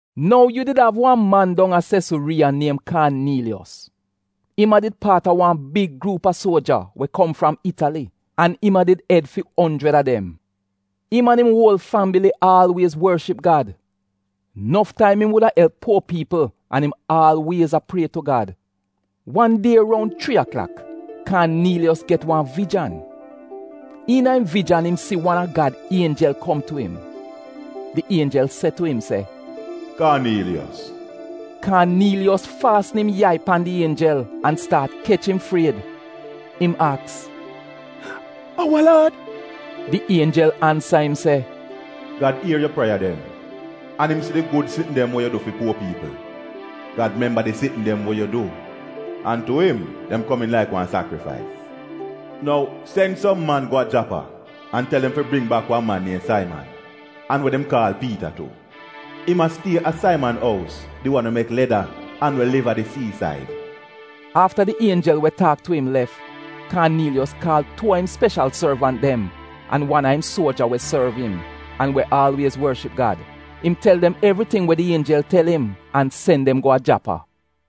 Nou yu did av wan man dong a Sesuriiya niem Kaaniiliyos. Im a did paat a wan big gruup a suoja we kom fram Itali, an im a did ed fi onjrid a dem. Im an im uol fambili aalwiez worship Gad. Nof taim im wuda elp puo piipl an im aalwiez a prie tu Gad. Wan die roun chrii aklak, Kaaniiliyos get wan vijan. Iina im vijan im si wan a Gad ienjel kom tu im. Di ienjel se tu im se, “Kaaniiliyos!” Kaaniiliyos faasn im yai pan di ienjel an staat kech im fried. Im aks, “A wa Laad?” Di ienjel ansa im se, “Gad ier yu prieya dem, an im si di gud sitn dem we yu du fi puo piipl. Gad memba di sitn dem we yu du, an dem komiin tu im laik wan sakrifais. Nou sen som man go a Japa an tel dem fi bring bak wan man niem Saiman, an we dem kaal Piita tu. Im a stie a Saiman ous, di wan we mek leda an we liv a di siisaid.” Afta di ienjel we taak tu im lef, Kaaniiliyos kaal tuu a im speshal sorvant dem an wan a im suoja we sorv im an we aalwiez worship Gad. Im tel dem evriting we di ienjel tel im an sen dem go a Japa.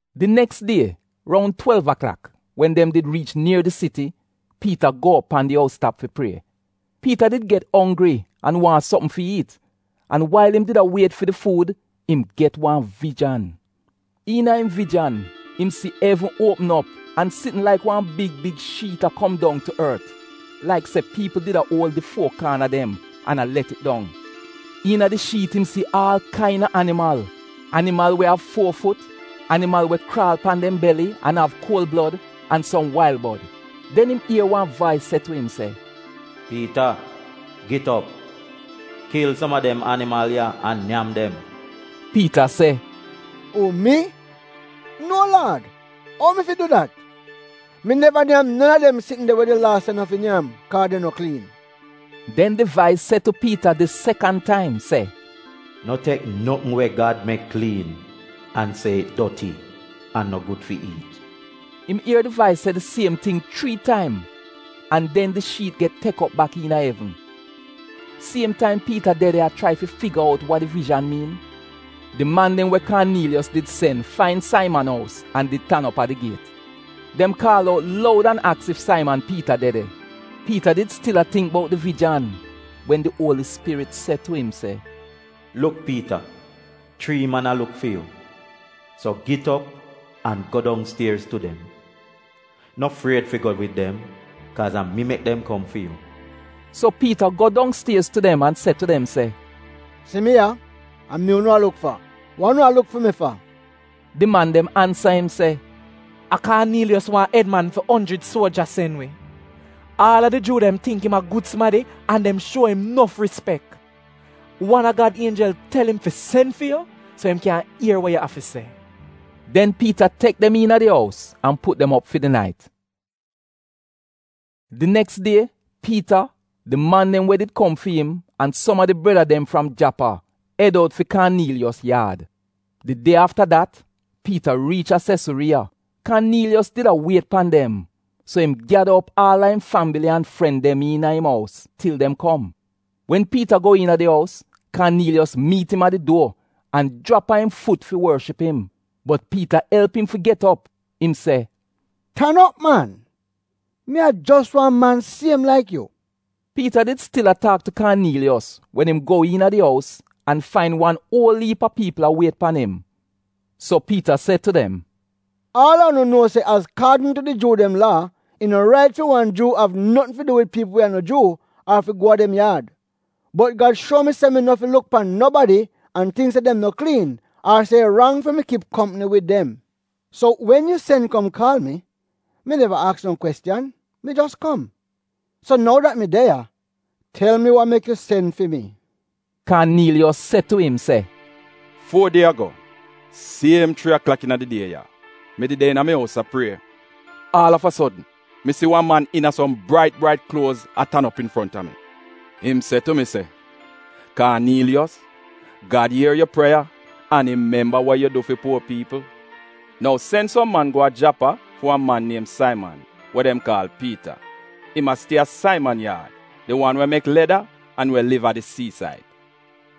Di neks die, roun twelv aklak, wen dem did riich nier di siti, Piita go op pan di ous tap fi prie. Piita did get onggri an waahn sopm fi iit, an wail im did a wiet fi di fuud im get wan vijan. Iina im vijan im si evn uopm op an sitn laik wan big big shiit a kom dong tu ort, laik se piipl did a uol di fuo kaana dem an a let it dong. Iina di shiit im si aal kaina animal: animal we av fuo fut, animal we kraal pan dem beli an av kuol blod, an som wail bod. Den im ier wan vais se tu im se, “Piita, git op, kil som a dem animal ya an nyam dem.” Piita se, “Uu mi? No Laad, ou mi fi du dat? Mi neva nyam non a dem de sitn de we di Laa se no fi nyam kaaz dem no kliin.” Den di vais se tu Piita di sekan taim se, “No tek notn we Gad mek kliin an se it doti an no gud fi iit.” Im ier di vais se di siem ting chrii taim, an den di shiit get tek op bak iina evn. Siem taim Piita de de a chrai fi figa out wa di vijan miin, di man dem we Kaaniiliyos did sen fain Saiman ous an did tan op a di giet. Dem kaal out loud an aks ef Saiman Piita de de. Piita did stil a tingk bout di vijan wen di Uoli Spirit se tu im se, “Luk Piita, chrii man a luk fi yu. So git op an go dongstiez tu dem. No fried fi go wid dem, kaaz a mi mek dem kom fi yu.” So Piita go dongstiez tu dem an se tu dem se, “Si mi ya, a mi unu a luk fa. Wa unu a luk fi mi fa?” Di man dem ansa im se, “A Kaaniiliyos, wan ed man fi onjrid suoja sen wi. Aal a di Juu dem tingk im a gud sumadi an dem shuo im nof rispek. Wan a Gad ienjel tel im fi sen fi yu so im kyan ier wa yu av fi se.” Den Piita tek dem iina a di ous an put dem op fi di nait. Di neks die Piita, di man dem we did kom fi im, an som a di breda dem fram Japa ed out fi Kaaniiliyos yaad. Di die afta dat Piita riich a Sesuriiya. Kaaniiliyos did a wiet pan dem, so im gyada op aal a im fambili an fren dem iina im ous til dem kom. Wen Piita go iina di ous, Kaaniiliyos miit im a di duor an jrap a im fut fi worship im. Bot Piita elp im fi get op. Im se, “Tan op man, mi a jos wan man siem laik yu.” Piita did stil a taak tu Kaaniiliyos wen im go iina di ous an fain wan uol iip a piipl a wiet pan im. So Piita se tu dem, “Aal a unu nuo se azkaadn tu di Juu dem Laa, it no rait fi wan Juu fi av notn fi du wid piipl we a no Juu, ar fi go a dem yaad. Bot Gad shuo mi se mi no fi luk pan nobadi an tingk se dem no kliin ar se it rang fi mi kip kompni wid dem. So wen yu sen kom kaal mi, mi neva aks no kwestiyan, mi jos kom. So nou dat mi de ya, tel mi wa mek yu sen fi mi?” Kaaniiliyos se tu im se, “Fuo die ago, siem chrii aklak iina di die ya, mi did de iina mi ous a prie. Aal av a sodn mi si wan man iina som brait brait kluoz a tan op infronta mi. Im se tu mi, ‘Kaaniiliyos, Gad ier yu prieya an im memba wa yu du fi puo piipl. Nou sen som man go a Japa fi wan man niem Saiman, we dem kaal Piita. Im a stie a Saiman yaad, di wan we mek leda an we liv a di siisaid.’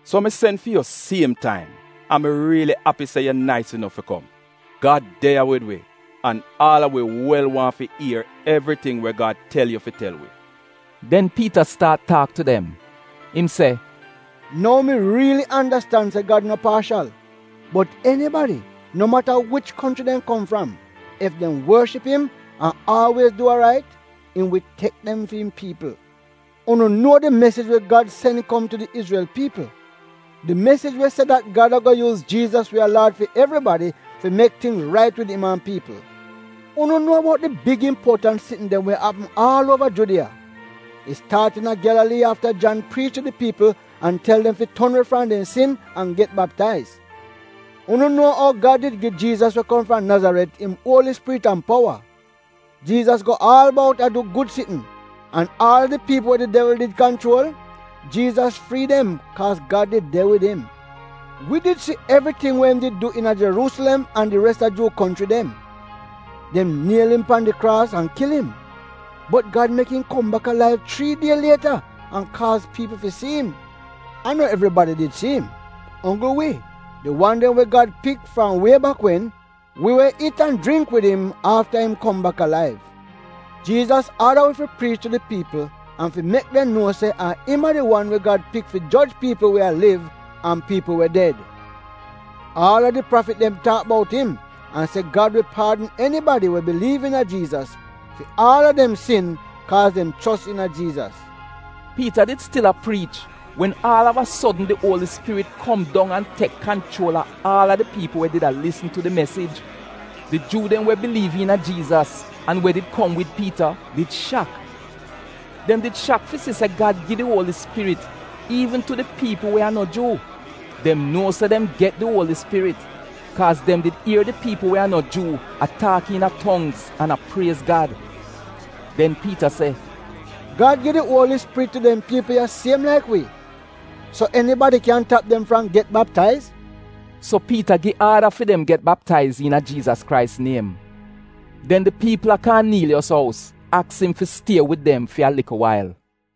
So mi sen fi yu siem taim, an mi riili api se yu nais inof fi kom. Gad de ya wid wi an aal a wi wel waahn fi ier evriting we Gad tel yu fi tel wi.” Den Piita staat taak tu dem. Im se, “Nou mi riili andastan se Gad no paashal, bot enibadi, no mata wich konchri dem kom fram, ef dem worship im an aalwiez du we rait, im wi tek dem fi'im piipl. Unu nuo di mesij we Gad sen kom tu di Izrel piipl. Di mesij we se dat Gad ago yuuz Jiizas we a Laad fi evribadi fi mek tingz rait wid im an piipl. Unu nuo bout di big impuotant sitn dem we apm aal uova Judiya. It staat iina Gyalalii afta Jan priich tu di piipl an tel dem fi ton we fram dem sin an get baptaiz. Unu nuo ou Gad did gi Jiizas we kom fram Nazaret im Uoli Spirit an powa. Jiizas go aal bout a du gud sitn, an aal a di piipl we di devl did kanchuol, Jiizas frii dem kaaz Gad did de wid im. “Wi did si evriting we im du iina Jeruusilem an di res a Juu konchri dem. Dem niel im pan di kraas an kil im. Bot Gad mek im kom bak alaiv chrii die lieta an kaaz piipl si im. A no evribadi did si im, onggl wi, di wan dem we Gad did pik fram wie bak wen - wi we iit an jringk wid im afta im kom bak alaiv. Jiizas aada wi fi priich tu di piipl an fi mek dem nuo se a im a di wan we Gad pik fi joj piipl we a liv an piipl we ded. Aal a di prafit dem taak bout im an se Gad wi paadn enibadi we biliiv iina Jiizas fi aal a dem sin kaaz dem chos iina Jiizas.” Piita did stil a priich wen aal av a sodn di Uoli Spirit kom dong an tek kanchuol a aal a di piipl we did a lisn tu di mesij. Di Juu dem we biliiv iina Jiizas an we did kom wid Piita did shak. Dem did shak fi si se Gad gi di Uoli Spirit iivn tu di piipl we a no Juu. Dem nuo se dem get di Uoli Spirit kaaz dem did ier di piipl we a no Juu a taak iina tongz an a priez Gad. Den Piita se, “Gad gi di Uoli Spirit tu dem piipl ya siem laik wi, so enibadi kyan tap dem fram get baptaiz? So Piita gi aada fi dem get baptaiz iina Jiizas Krais niem. Den di piipl a Kaaniiliyos ous aks im fi stie wid dem fi a likl wail.